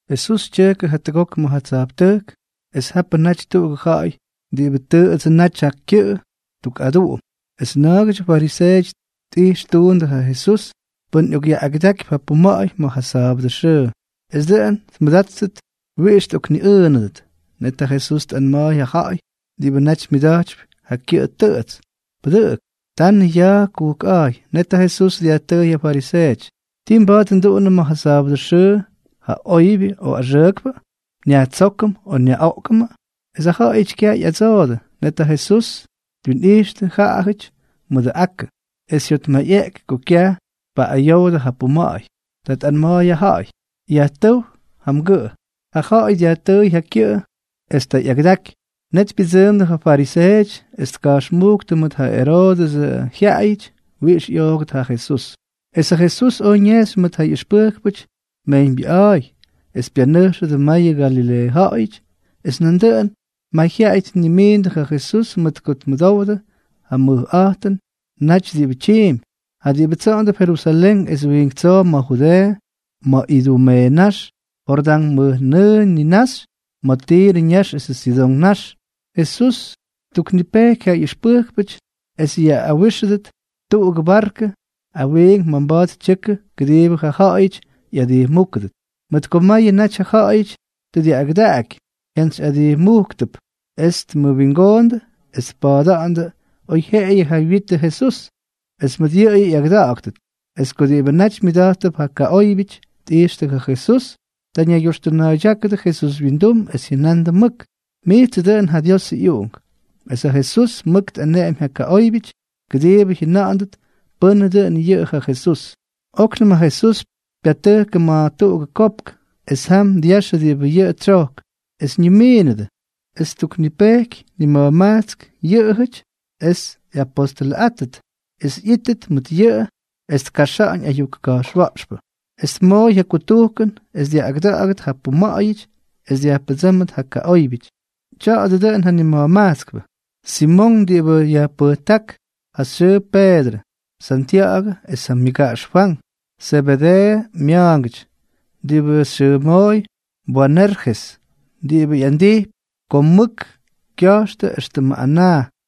Jesús tyʉjkʉ jatʉgok ma̱ ja tsa̱jptʉjk, es japʉ naty tuꞌugʉ ja̱ꞌa̱y diꞌibʉ tʉꞌʉdsʉ naty ja kyʉꞌʉ tuk aduꞌum. Es na̱a̱gʉdyʉ fariseeʉty tꞌix ttundʉ ja Jesús pʉn ꞌyokꞌyaꞌꞌagʉdakypy ja puma̱ꞌa̱y ma̱ ja sa̱a̱bʉdʉ xʉʉ, es dʉꞌʉn tmʉdáttʉt wiꞌix tꞌokniꞌʉʉnʉdʉt. Net ja Jesús tꞌanma̱a̱y ja ja̱ꞌa̱y diꞌibʉ naty myʉda̱jtypy ja kyʉꞌʉ tʉꞌʉts: —Pʉdʉꞌʉk. Tanʉ ya̱a̱ kujkꞌa̱a̱y. Net ja Jesús dyajtʉʉy ja fariseeʉty: —¿Ti mba̱a̱t nduꞌunʉm ma̱ ja sa̱a̱bʉdʉ xʉʉ, ja oybyʉ o axʉʉkpʉ? ¿Nyajtsókʉm o nyaꞌoꞌkʉmʉ? Es jaꞌajʉty kyaj ꞌyadsoodʉ. Net ja Jesús twinꞌijxtʉ jaꞌajʉty mʉdʉ akʉ, es jyotmayꞌeꞌky ko kyaj tpaꞌꞌayowdʉ ja kʉpuma̱ꞌa̱y. Ta tꞌanma̱a̱y ja ja̱ꞌa̱y: —Yajtʉ́w ja mgʉꞌʉ. Ja ja̱ꞌa̱y dyajtʉʉy ja kyʉꞌʉ, es ta ꞌyakʉdaky. Net pyʉdsʉʉmdʉ ja fariseeʉty es tka̱jxmúktʉ mʉt ja Eroodʉsʉ jyaꞌayʉty wiꞌix ꞌyoogʉt ja Jesús. Es ja Jesús oj ñejxy mʉt ja ꞌyʉxpʉjkpʉty mejyñbyʉꞌa̱a̱y, es pyanʉjxʉdʉ mayʉ Galileeʉ ja̱ꞌa̱yʉty. Es nandʉꞌʉn mayjyaꞌay tnimiindʉ ja Jesús mʉt ko tmʉdowdʉ ja mʉjꞌa̱jtʉnʉty diꞌibʉ tyiimpy. Ja diꞌibʉ tsoꞌondʉp Jerusalén es wiink tsoo ma̱ Judeeʉ, ma̱ Idumeeʉ ñax, Jordán mʉjnʉʉ ninaxy, ma̱ Tirʉ ñax esʉ Sidón ñax. Jesús ttuknipejky ja ꞌyʉxpʉjkpʉty es yaꞌꞌawijxʉdʉt tuꞌugʉ barkʉ awiink ma̱ mba̱a̱t tyʉkʉ kʉdiibʉ ja ja̱ꞌa̱yʉty ꞌyadijmúkʉdʉt. Mʉt ko mayʉ naty ja ja̱ꞌa̱yʉty tʉ dyaꞌꞌagʉdaꞌaky, jyantsyꞌadijmujktʉp es tmʉwingoondʉ es tpa̱a̱da̱ꞌa̱ndʉ oyjyeꞌeyʉ ja wyitʉ Jesús, es mʉt yʉꞌʉyʉ ꞌyagʉda̱ꞌa̱ktʉt. Es ko diꞌibʉ naty myʉda̱jttʉp ja kaꞌóybyʉty tꞌijxtʉ ja Jesús, ta ñaygyoxtʉna̱a̱ydyákʉdʉ Jesús wyindum es jyʉna̱ꞌa̱ndʉ mʉk: —¡Mijtsʉ dʉꞌʉn ja Diosʉ ꞌyUꞌunk! Es ja Jesús mʉk tꞌaneꞌemy ja kaꞌóybyʉty kʉdiibʉ jyʉna̱ꞌa̱ndʉt pʉ́nʉ dʉn yʉꞌʉ ja Jesús. Oknʉm ja Jesús pyatʉjkʉ ma̱ tuꞌugʉ kopk, es jam dyaxʉ diꞌibʉ yʉꞌʉ tsyojk. Es ñimiinʉdʉ. Es ttuknipejky nima̱jmajtsk yʉꞌʉjʉty es ꞌyapóstʉlʉꞌáttʉty, es ꞌyíttʉt mʉt yʉꞌʉ es tkaxa̱ꞌa̱ñ ayuk ka̱jxwa̱ꞌxpʉ, es tmooy ja kutujkʉn es dyaꞌꞌagʉda̱ꞌa̱gʉt ja puma̱ꞌa̱yʉty es dyajpʉdsʉ́mʉt ja kaꞌóybyʉty. Tya̱a̱dʉ dʉꞌʉn ja nima̱jmajtskpʉ: Simonk diꞌibʉ yajpʉjták ja xyʉʉ Peedrʉ, Santya̱ꞌa̱gʉ es ja myʉgaꞌax Fwank, Zebedeeʉ mya̱a̱ngʉty, diꞌibʉ xyʉmooy Boanerjes (diꞌibʉ ꞌyandijpy ko mʉk kya̱jxtʉ, éxtʉmʉ anaa),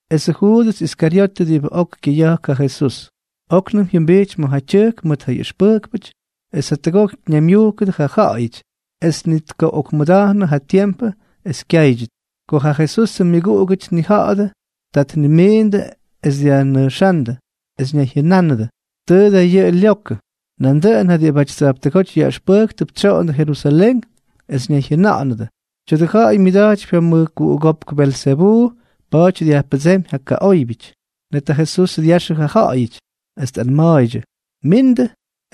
esʉ Juudʉs Iskaryotʉ diꞌibʉ ok kyʉya̱jk ja Jesús. Oknʉm jyʉmbijty ma̱ ja tyʉjk mʉt ja ꞌyʉxpʉjkpʉty, es jatʉgok ñaymyujkʉdʉ ja ja̱ꞌa̱yʉty, es ni tkaꞌokmʉda̱jnʉ ja tiempʉ es kyáydyʉt. Ko ja Jesusʉ myʉguꞌugʉty tnija̱ꞌa̱dʉ, ta tnimiindʉ es dyajnʉjxándʉ, es ñayjyʉnánʉdʉ: —Tʉʉ da yʉꞌʉ lyokʉ. Nandʉꞌʉn ja diꞌibʉty tsa̱jptʉgóty yaꞌʉxpʉjktʉp tsoꞌondʉ Jerusalén, es ñayjyʉna̱ꞌa̱nʉdʉ: —Tya̱dʉ ja̱ꞌa̱y myʉda̱jtypy ja mʉjkuꞌugópk Belzebuu, pa̱a̱ty dyajpʉdsémy ja kaꞌóybyʉty. Net ja Jesús dyaxʉ ja ja̱ꞌa̱yʉty, es tꞌanma̱a̱ydyʉ: —Mindʉ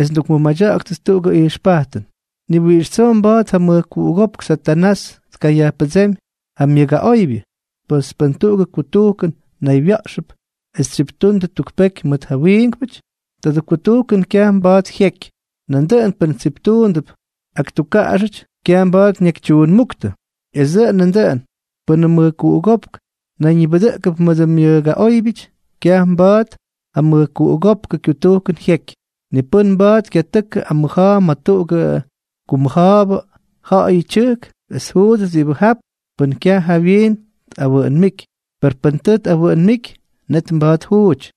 es ndukmʉmadya̱ꞌa̱ktʉt tuꞌugʉ ijxpajtʉn. ¡Ni wiꞌix tsoo mba̱a̱t ja mʉjkuꞌugópk Satanás tkayajpʉdsémy ja myʉgaꞌoybyʉ! Pes pʉn tuꞌugʉ kutujkʉn naywya̱ꞌxʉp es tsyiptundʉ tuk peky mʉt ja wiinkpʉty, tadʉ kutujkʉn kyaj mba̱a̱t jyeky. Nandʉꞌʉn pʉn tsiptuundʉp ak tukkaꞌaxʉty, kyaj mba̱a̱t ñakytyuunmúktʉ. Es dʉꞌʉn nandʉꞌʉn, pʉnʉ mʉjkuꞌugópk nayñibʉdʉꞌkʉp mʉdʉ myʉgaꞌóybyʉty, kyaj mba̱a̱t ja mʉjkuꞌugópkʉ kyutujkʉn jyeky. ’Ni pʉ́n mba̱a̱t kyatʉkʉ amʉja̱a̱ ma̱ tuꞌugʉ kumʉja̱a̱bʉ ja̱ꞌa̱yʉ tyʉjk es tjuudʉt diꞌibʉ jap pʉn kyaj jawyiin tꞌawʉʉnmíky. Per pʉn tʉ tꞌawʉʉnmíky, net mba̱a̱t tjuuty.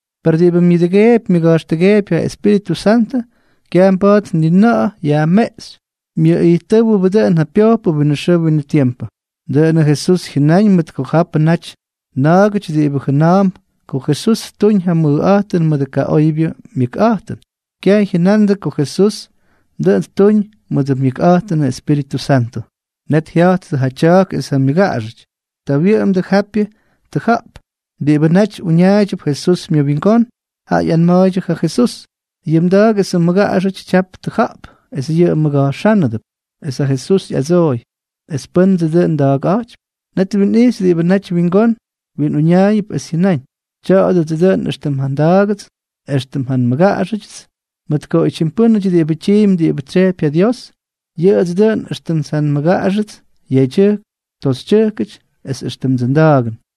per diꞌibʉ myʉꞌꞌʉdʉgeepy myʉga̱jxtʉgeepy ja Espíritʉ Santʉ, kyaj mba̱a̱t ni na̱ꞌa̱ yajmeꞌxy, myʉꞌijttʉ́wʉbʉ dʉꞌʉn ja pyojpʉ winʉ xʉʉ winʉ tiempʉ. Dʉꞌʉnʉ Jesús jyʉnáñ mʉt ko japʉ naty na̱a̱gʉty diꞌibʉ jʉna̱a̱mp ko Jesús ttuñ ja mʉjꞌa̱jtʉn mʉdʉ kaꞌoybyʉ myʉkꞌa̱jtʉn, kyaj jyʉnandʉ ko Jesús dʉꞌʉn ttuñ mʉdʉ myʉkꞌa̱jtʉnʉ Espíritʉ Santʉ. Net jya̱jttʉ ja tya̱a̱k es ja myʉgaꞌaxʉty. Ta wyʉꞌʉmdʉ japyʉ tʉja̱ꞌp. Diꞌibʉ naty uñaaydyʉp Jesús myʉwingón, jaꞌa ꞌyanma̱a̱ydyʉ ja Jesús: —Yʉ mda̱a̱k esʉ mmʉgaꞌaxʉty tyap tʉja̱ꞌp, es yʉꞌʉ mmʉga̱jxánʉdʉp. Es ja Jesús ꞌyadsooy: —¿Pʉ́ndsʉ dʉꞌʉn nmʉgaꞌaxꞌa̱jtypy es pʉ́ndsʉ dʉꞌʉn nda̱a̱kꞌa̱jtypy? Net twinꞌijxy diꞌibʉ naty wingón winꞌuñaayʉdʉp, es jyʉnáñ: —Tya̱a̱dʉdsʉ dʉꞌʉn éxtʉm ja nda̱a̱gʉts es éxtʉm ja nmʉgaꞌaxʉdyʉts. Mʉt ko oytyim pʉ́nʉty diꞌibʉ tyiimpy diꞌibʉ tsyejpy ja Dios, yʉꞌʉdsʉ dʉꞌʉn éxtʉm ja nmʉgaꞌaxʉts yedyʉjk toxytyʉjkʉty es éxtʉmdsʉ nda̱a̱gʉn.